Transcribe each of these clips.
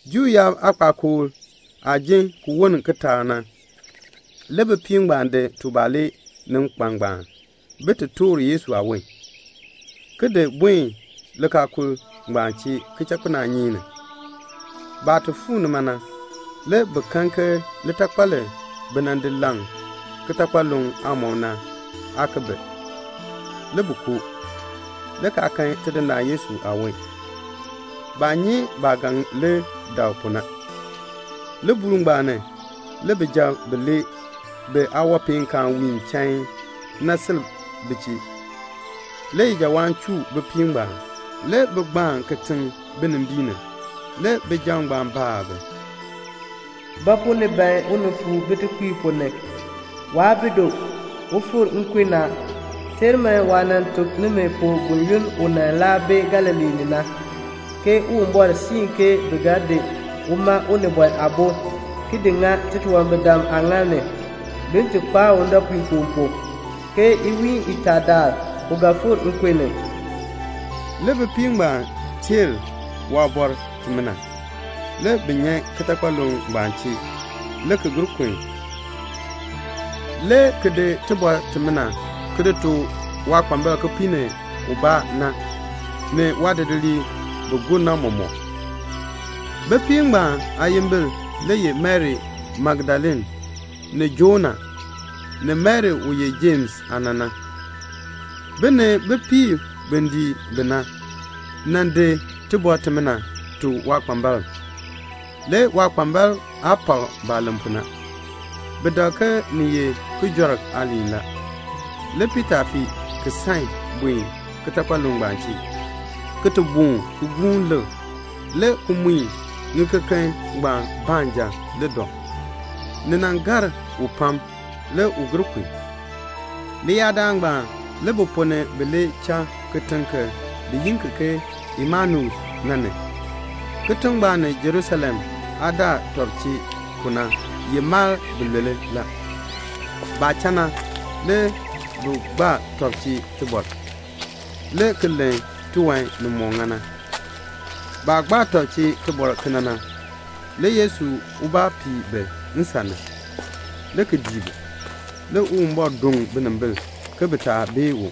Juu yaab aakpakool daal aah jin ki woln kitaak na, le bipiib ngbaan di tubalee ni nkpan ngbaan bin ti toor Yesu aawon, ki di buen likaakul ngbaan chee kichakpinaanyeek ni. Baah ti fuu nima na, le bi kan ke litakpal li bi nan di leŋ kitakpaluŋ aamɔb na, aa ki bi. Le bi koo, le kaa kan Tidindaan Yesu aawon. Baa nyi baah ga dak pu na. Libuul ngbaan ni le bijab bilee biyaawanpeenkaan wiin chain na, si bi chee. Le ijawaan chuu bipiib ngbaan, le bi gbaan kitiŋ binimbiin ni. Le bijab ngbaan baa bi, "Ba pu ni ban unifuur bitekpiib ponn ni? Waa bi du. U fikr nkun ni a. Teer man waah nan tuk nimi pu buyoonn u laa bi Galilee ni na, ke Uwumbɔr siin ke bi ga di uma Unibɔn Aabo, ki di ŋa titunwambirdam aaŋaal ni, bin ti kpaa u ndɔpuinkoo pu, ke iwiin itaa daal u ga fikr nkun ni." Le bipiib ngbaan teer waaliin imina. Le bi nyan kitakpaluŋ ngbaan chee, le ki gir kun, le ki di tibɔr timina ki tuk waakpambalb kipiik ni ubaa, ni waadidiliib bi gur na mɔmɔk. Bipiib ngbaan aayimbil ye Mari Magdalene, ni Joana, ni Mari u ye Jems aana na. Bi ni bipiib bi dii bi na, di tibɔr timina, ki tuk waakpambalb. Le waakpambalb aa pak baah len pu na. Bi dak ke ni ye kijɔrk aaliin la. Le Piita fii ki san buen kitakpaluŋ chee, ki boon ki gbuun lik, le ki mui ŋikeken ngbaan baanja le dɔ. Ni gar u pam. Le u gir kun. Leyaadaal ngbaan le bi ponn ni bilee cha kitiŋ kibaa, bi yi ki ke Emaus. Kitiŋ ngbaan ni Jerusalem daa tɔb mal bilule la. Baah cha na, le bi gbaa tɔb chee tibɔr, le ki len tiwan nimɔk ŋa na. Baah gbaa tɔb chee tibɔr kena na, le Yesu ubaa pii bi nsan ni, le ki dii bi. Le Uwumbɔr doŋ binimbil ke bi taa bee u.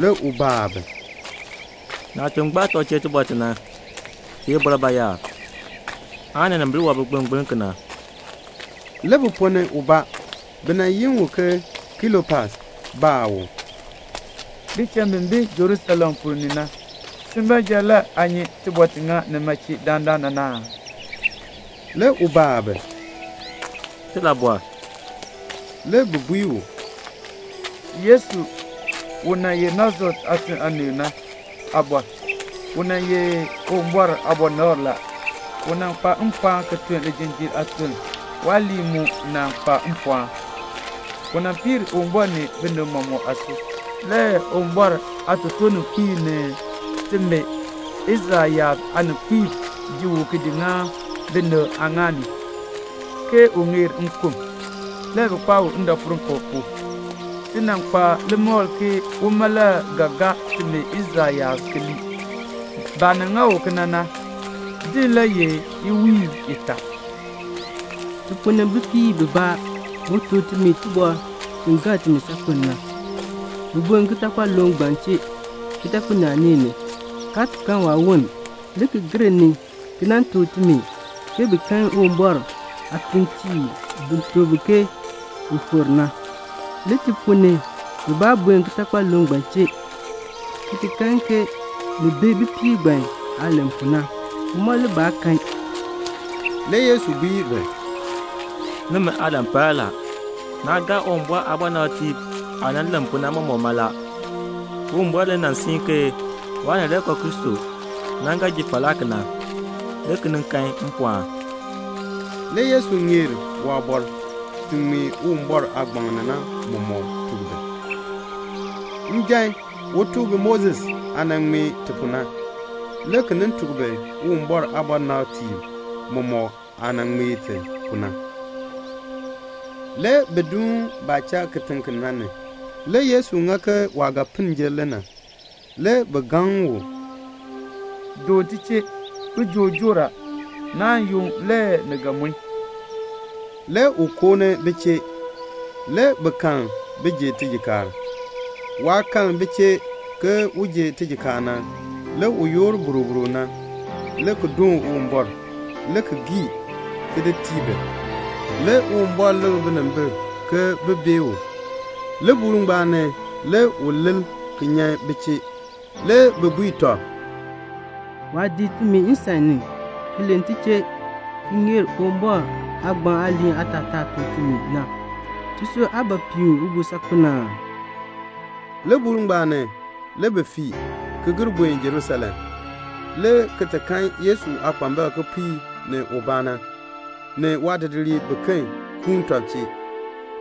Le u baa bi, "Naah chuun gbaa tɔb chee tibɔr ti na, ti ye bɔr bayaar, aan ninimbil wɔb bi gbilngbiln kena?" Le bi ponn ni ubaa, bi yi u ke Kleopas, baa u, "Bicham bi bi Jerusalem ponn ni na, si baanja le aa nyi tibɔr ti ŋa nima chee dandana na aa?" Le u baa bi, "Tilabɔr?" Le bi bui u, "Yesu u nan ye Nasaret aatiŋ aanii na aabɔr. U nan ye Uwumbɔr aabɔnabr la. U nan kpa mpɔɔn ki tun lijinjiir aatun; waaliin mu nan kpa mpɔɔn. U piir Uwumbɔr ni binib mɔmɔk aasui. Le Uwumbɔr aatotoorninkpiib ni timi Israel yaab aaninkpiib di u di ŋa binib aaŋaal ni, bin ti len ke u ŋeer nkun. Le bi kpaa u ndɔpuinkoo pu. Ti nan kpa limakl ke uma le ga gaa timi Israel yaab ki lii. Baah nan ŋa u kena na, din le ye iwiin itaa. Ti ponn ni bipiib bibaa mu tuk timi tibɔr ti gar timi saakpen na. Bi buen kitakpaluŋ ngbaan chee kichakpinaanyeek ni, kaa kan waawon, le ki gir ni ki nan tuk timi ke bi kan Uwumbɔr aatuuntiib bi tuk bi ke u fikr a. Le ti ponn ni bibaa buen kitakpaluŋ ngbaan chee, ki kan ni bi bipiib ngbaan aah len pu na. Uma le baa kan." Le Yesu bui bi, "Nimi aalan par la. Naa gaa Uwumbɔr aabɔnabtiib aah nan len pu na mɔmɔk mala. Uwumbɔr le nan siin ke Waanileekoo Kristo na ga ji falaa kena, le ki nin kan mpɔɔn." Le Yesu ŋeer tuk bi waabɔr ti ŋmee Uwumbɔr aagbaŋ mɔmɔk ni na. Njan u tuk bi Moses aah nan ŋmee ti pu na, le ki nin tuk bi Uwumbɔr aabɔnabtiib mɔmɔk aah nan ŋmee ti pu na. Le bi duun baah cha kitiŋ ki na ni. Le Yesu ŋa ke waah ga piln jer le na. Le bi gaŋ u, "Doon ti chee. Kijook joor a. Naan yunn le ni ga mue." Le u koo ni bi chee. Le bi kal bin ji tijikaar. Waah kal bi chee ke un ji tijikaar na, le u yoor boroboro na, le ki doon Uwumbɔr, le ki gii, le ki di tii bi. Le Uwumbɔr likr binimbil ke bin bee u. Libuul ngbaan ni le u lil ki nyan bi chee. Le bi bui tɔb, "Waah dii timi nsan ni ki len ti chee ki ŋeer tuk timi Uwumbɔr aagbaŋ aaliin aatataa na, tisui aa piin u pu saakpen aa?" Libuul ngbaan ni, le bi fii, ki gir buen Jerusalem, le ki kan Yesu aakpambalb kipiik ni ubaa, ni waadidiliib biken kuun tɔb chee.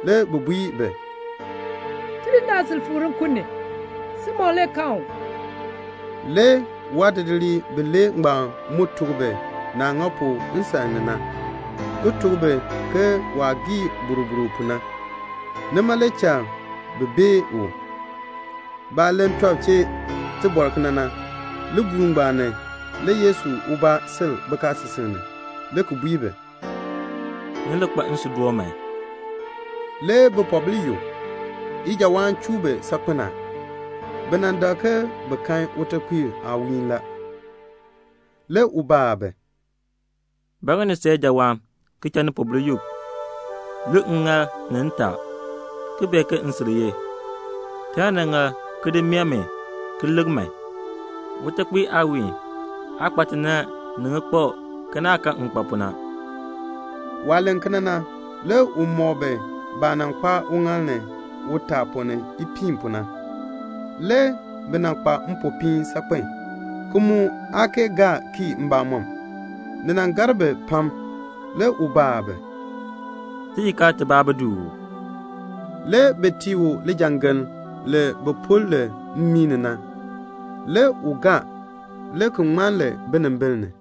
Le bi bui bi, "Tidindaan sil fikr nkun ni. Simon le kan u." Le waadidiliib bilee ngbaan mu tuk bi naah ŋa pu nsan ni na, ki tuk bi ke waah gii boroboro pu na, nima le cha bi bee u. Baah len tɔb chee tibɔr kena na, libuul ngbaan ni le Yesu ubaa sil bikaasisik ni, le ki bui bi, "Ni li kpa nsuudoon man." Le bipoobil yuk a; ijawaan chuu bi saakpen a. Bi dak ke bi kan utekpiir aawiin la. Le u baa bi, "Ba ŋa ni san ijawaan ki cha nipoobil yuk? Lik ŋŋaal ni ntaa, ke min mbaa ye. Taln niŋaal ki di meeh mi ki lik. Utekpiir aawiin aa kpa tinann ni ŋikpab ke naah kan maah kpa ni na." Waah len kena na, le u mɔk bi baah nan kpaa uŋaal ni utaa ponn ni ipiin pu na. Le bi kpa mpopiin saakpen, kaa kee gaa kii mbamɔm. Ni gar bi pam. Le u baa bi, "Tijikaar tibaa bi du uu?" Le bi tii u lijangeln li bi pul li mmii ni na. Le u gaa, le ki ŋman li binimbil ni.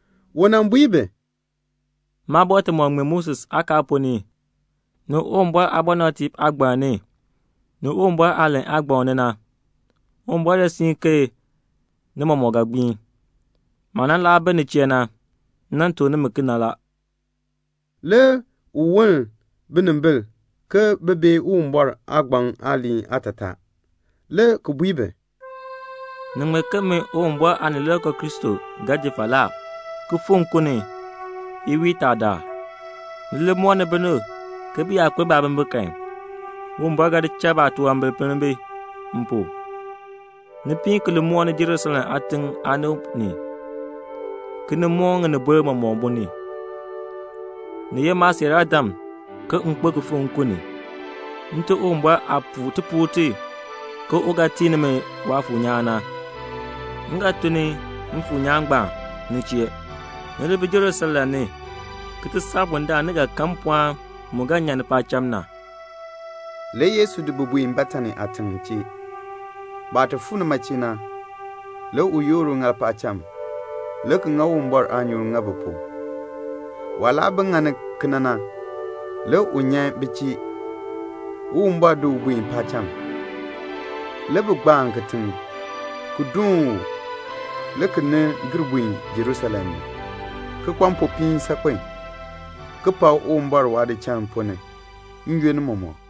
Le u bui bi, "Maabɔr timɔk ŋmee Moses aakaal ponn ni, ni Uwumbɔr aabɔnabtiib aagbaŋ ni, ni Uwumbɔr aalahn aagbaŋ ni na, Uwumbɔr le siin ke ni mɔmɔk ga gbiin. Maah nan laa bi ni chee na, m nan tuk nimi kena la." Le u woln binimbil bin bee Uwumbɔr aagbaŋ aaliin aatataa, le ki bui bi, "Ni ŋmee ke min Uwumbɔr Aanileekoo Kristo ga ji falaa, ki fikr nkun ni iwiin itaa daal. Ni li mooni binib ke bi yaa kpeln baabimbin kan, Uwumbɔr ga di cha baatunwambir pinn bi m pu. Ni piin ki li mooni Jerusalem aatiŋ aanib, le ki nin moon ŋinibol mɔmɔk. Ni ye maasiiraadam ke m kpo ki fikr nkun ni. Nte Uwumbɔr aah puu tipuul ti ke u ga tii nimi Waafuur nyaan na, m ga tun Mfuur nyaan ngbaan ni chee. Ni li bi Jerusalem ki ti saa bundaln ni ga kan mpɔɔn mu ga nyan paacham na." Le Yesu di bi ki di buen Betani aatiŋ chee. Baah ti fuu nima na, le u yoor uŋaal paacham, le ki ŋa Uwumbɔr aanyoor ki ŋa bi pu. Waah laa bi ŋani kena na, le u nyan bi chee, Uwumbɔr di u buen paacham. Le bi gbaan kitiŋ ki doon u, le ki nin gir buen Jerusalem, le ki kpa mpopiin saakpen, ki pak Uwumbɔr waadichal ponn ni n-yoonn mɔmɔk.